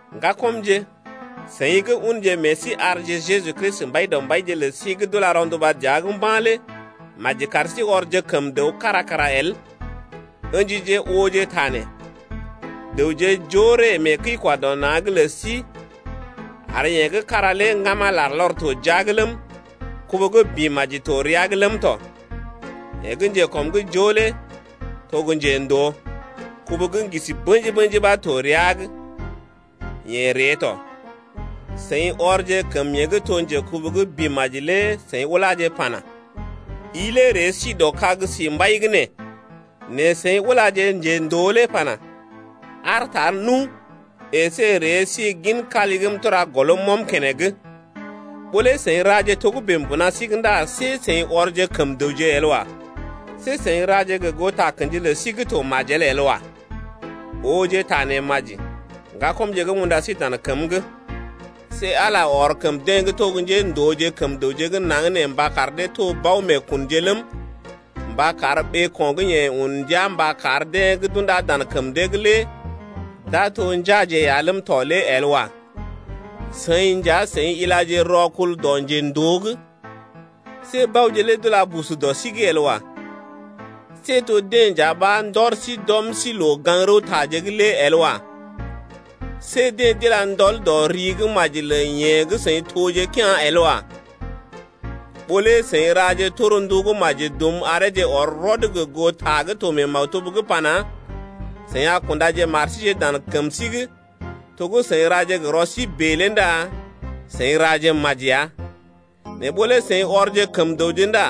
Ŋgakɔmje, seḭ gə́ unje meḛ sí arje Jeju Kristi Mbaidɔmbaije lə sí gə́ d’ula rɔnduba dəa’g mba̰ lé maji kar sí ɔrje kəm dəw kára kara el. Ǝ̰jije ta nee ooje: Dəwje joo ree mee kəi-kwa-dɔ-na̰’g lə sí ar yeḛ gə́ kára lé ŋgama larlɔr to jia’g ləm, kubu gə́ bḭ maji to rəa’g ləm tɔ. Yeḛ gə́ njekɔm’g joo lé to gə́ njendoo, kubu gə́ ŋgisi bḛji-bḛji ɓa to rəa’g yeḛ ree tɔ. Seḭ ɔrje kəm yeḛ gə́ to njekubu gə́ bḭ maji lé seḭ uláje pana: I lé ree s dɔ kag sí mbai gə́ nee, nɛ seḭ ulaje njendoo lé pana: Aar tar nu, əsé ree si gin kali gə́ m’tura gɔlm m’ɔm keneŋ. Ɓó lé seḭ raje togə́bè mbuna sí’g ndá see seḭ ɔrje kəm dəwje el wa. See seḭ raje gə goo takə̰ji lə sí gə́ to majel el wa. Ooje ta nee maji, ŋgakɔmje gə́ m’unda sí dan kəm’g: See Ala ɔr kəm deḛ gə́ to gə́ njéndooje kəm dəwje gə́ naŋg nee mba kar dee to bao-meekunje ləm, mba kar ɓeeko̰ gə́ yeḛ un ndia mba kar deḛ gə́ d’undá dan kəm dee’g lé d’a to njeaje ya ləm tɔ lé el wa. Seḭ nja, seḭ ilaje rɔkul dɔ njendoo’g. See baoje lé d’ula busu dɔ sí’g el wa. See to deḛ nja ɓa ndɔr sí d’ɔm sí loo-gaŋg-rəwtaje’g lé el wa. See dee d’ila ndɔl dɔ ri gə́ maji lə yeḛ gə́ seḭ toje kea̰ lé el wa. Ɓó lé, seḭ raje torndu gə́ maji dum areeje ɔr rɔd gə goo ta gə́ to mee maktub’g pana: Seḭ a kundaje mar síje dan kəm sí’g to gə́ seḭ ra gə rɔ sí bèe lé ndá seḭ raje maji ya. Nɛ ɓó lé seḭ ɔrje kəm dəwje ndá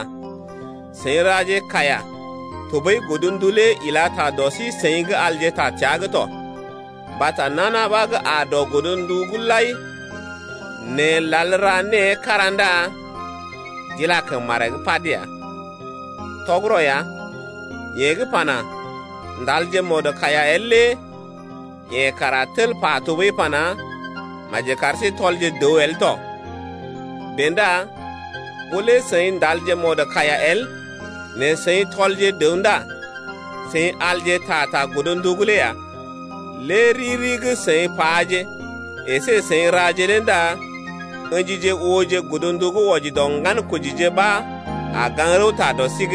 seḭ raje kaiya tɔɓəi godndu lé ila ta dɔ sí-seḭ gə́ alje ta təa’g tɔ. Mbata nana ɓa gə́ aa dɔ godnduje lai nɛ lal ra née kára ndá d’ila kəm maree’g pad ya. Tɔgərɔ ya, yeḛ gə́ pana: Ndalje mɔdkaiya el lé yeḛ kara tel pa tɔɓəi pana: Maji kar sí tɔlje dəw el tɔ. Bèe ndá ɓó lé seḭ ndalje mɔdkaiya el nɛ seḭ tɔlje dəw ndá seḭ alje ta ta godndu’g lé ya. Lé riri gə́ seḭ paje əsé seḭ raje lé ndá ə̰jije ooje godndu gə́ wɔji dɔ ŋgankojije ɓa a gaŋg rəwta dɔ sí’g.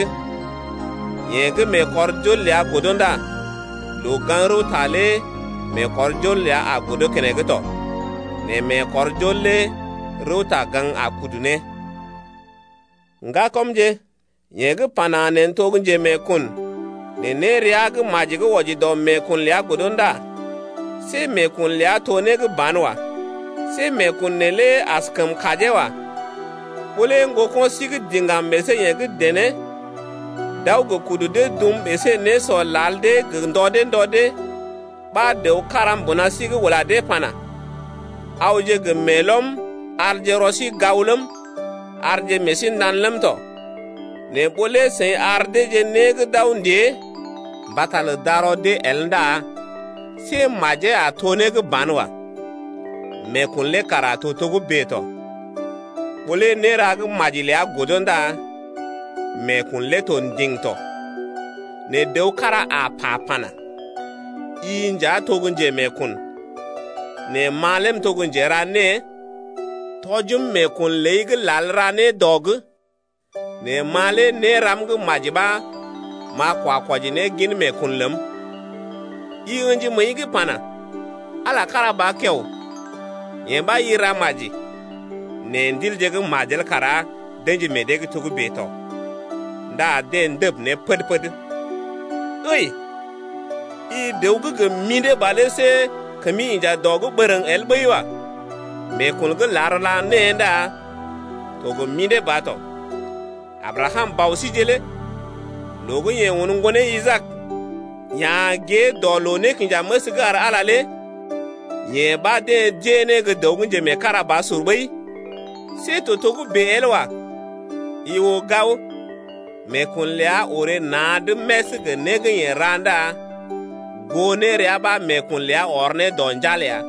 Yeḛ gə́ meekɔrjol ləa godo ndá loo-gaŋg-rəwta lé meekɔrjol ləa a godo keneŋ tɔ. Nɛ meekɔrjol lé rəwta-gaŋg a kudu ne tɔ. Ŋgakɔmje, yeḛ gə́ pana: Neḛ n’to gə́ njemeekun, nɛ nérea gə́ maji gə́ wɔji dɔ meekun ləa godo ndá see meekun ləa to né gə́ banwa. See meekun neelé askəm kajee wa. Ɓó lé ŋgoko̰ sí gə́ diŋgam əsé yeḛ gə́ dené d’aw gə kudu dee dum əsé nésɔ lal dee gə ndɔ dee ndɔ dee ɓa dəw kára mbuna sí’g ula dee pana: Awje gə meelɔm arje rɔ sí gao ləm, arje meḛ sí nda̰ ləm tɔ, nɛ ɓó lé seḭ ar deeje né gə́ d’aw ndée mbata lə darɔ dee el ndá see majee a to né gə́ banwa. Meekun lé kara to togə́bè tɔ. Ɓó lé néra gə́ maji ləa godo ndá meekun lé to ndiŋ tɔ. Nɛ dəw kára a pa pana: I nja to gə́ njemeekun, nɛ ma lé m’to gə́ njera née. Tɔjim meekun ləi gə́ lal ra né dɔ’g, nɛ ma lé néram gə́ maji ɓa m’a kwa kwɔji ne gin meekun ləm. I ə̰ji məəi’g pana: Ala kára ba kiao, yee ɓa i ra maji, nɛ ndilje gə́ majel kara d’ə̰ji meḛ dee’g togə́bè tɔ ndá dee ndəb ne pəd-pəd. Ǝi, i dəw gə́ gə mḭdé ba lé see kəmi inja dɔ’g bərəŋ el ɓəi wa. Meekun gə́ lal ra née ndá to gə mḭdé ba tɔ. Abrakam, bɔ síje lé loo gə́ yeḛ un ŋgonee Isaak ya̰ gée dɔ loo-nékinjaməs’g ar Ala lé yee ɓa deḛ d’ée né gə́ dəw gə́ njemeekarabasur ɓəi. See to togə́bè el wa. I oo gao, meekun ləa orè na̰’d més gə né gə́ yeḛ ra ndá goo nérea ɓa meekun ləa ɔr ne dɔ njal ya.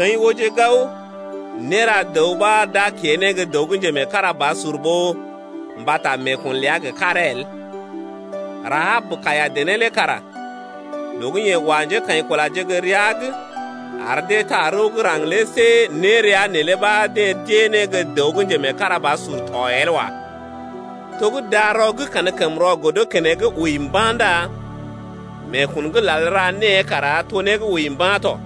Seḭ ooje gao, néra dəw ɓa, d’a kée ne gə́ dəw gə́ njemeekarabasur ɓó mbata meekun ləa gə́ karee el. Rahab, kaiya-dené lé kara loo gə́ yeḛ wa njékaḭkulaje gə́ rəa’g ar dee taa rəw gə́ raŋg lé see nérea neelé ɓa deḛ d’ée ne gə́ dəw gə́ njemeekarabasur tɔ el wa. To gə́ darɔ gə́ kankəmrɔ godo keneŋ wəi mba̰ ndá meekun gə́ lal ra née kara to né gə́ wəi mba̰ tɔ.